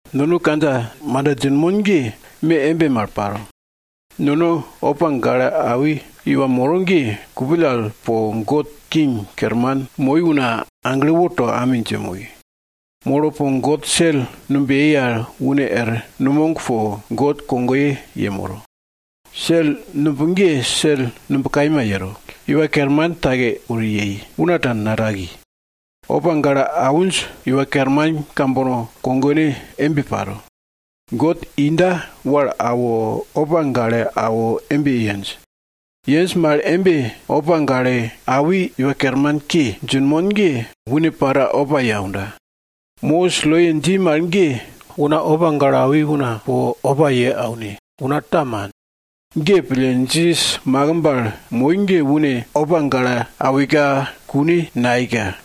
Nono kandja manda djinmon ge, me embe mal paro. Nono opa gale awi iwa moro ge kupill al po God King kerman moi una agle woto ami dje moi. Molo po God sel numb yei al une er numog po God kogoye yemoro. Sel numb ge sel numb kaima yero. Iwa Kerman take wori yei, una ta nataki. Opa gale awinj iwa kerman kambono kogone embe paro. God inda wal awo, opa gale awo embe yenj. Yenj mal embe opa gale awi Iwa Kermanke djinmon ge, une para opa ye aunda. Mosis loye dji mal ge, una opa gale awi una po opa ye aune, una ta man. Ge pille, Jisas makimb al moi ge une opa gale awika kune nayeika.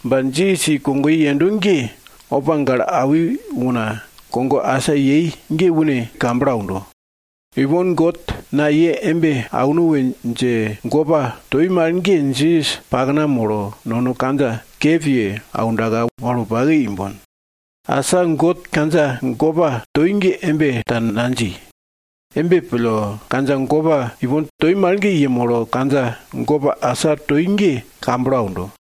Ba Jisas i kogoye yendo ge, opa gale awi una kogo asa yei ge une kamblo aundo. Ipon God na ye embe auno we dje gopa toi mal ge, Jisas pakna molo nono kandja kep ye aundaka wal wopake imbon. Asa God kandja gopa toi ge embe ta nadji. Embe pille, kandja gopa ipon toi mal ge yemolo kandja gopa asa toi ge kamblo aundo.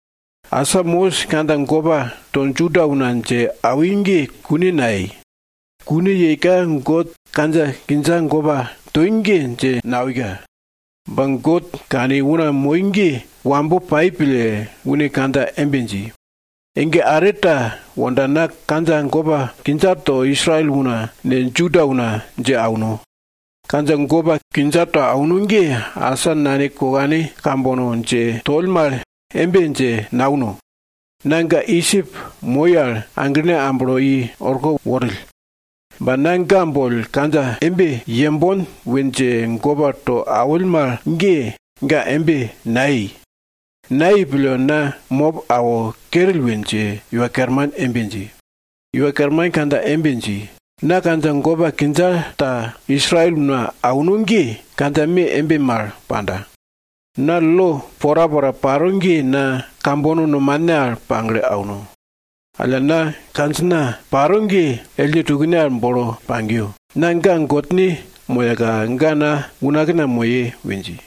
Asa Mosis kandja gopa to Juda una dje awi ge kune nayei. Kune yeika God kandja kindja gopa toi ge dje nawika. Ba God kani una moi ge wambo pai pille, une kandja embe dji, Ege are ta wonda na kandja gopa kindja to Israel una ne, Juda una dje auno. Kandja gopa kindja to auno ge, asa nane kokane kambono dje toll mal embe dje nauno. Na ga Idjip moi al aglene amblo i orko worill. Ba na ga boll kandja embe yembon we dje gopa to awill mal ge, ga embe nayei. Nayei pille, na mop awo kerill we dje Iwa Kerman embe dji. Iwa Kerman kandja embe dji, na kandja gopa kindja to Israel una auno ge kandja me embe mal panda. Na lo porapora paro ge na kambono nomane al pagle auno. Alla na kandjina paro ge ellne tukne al bolo pagiyo. Na ga Godne moyaka ga na unakna moye we dji.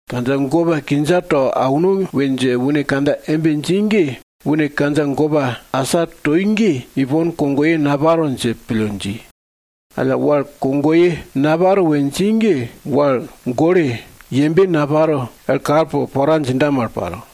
Kandja gopa kindja to auno we dje une kandja embe dji ge, une kandja gopa asa toi ge ipon kogoye naparo dje pille dji. Alla wal kogoye naparo we dji ge, wal gole, yembe naparo er kal po pora djinda mal paro.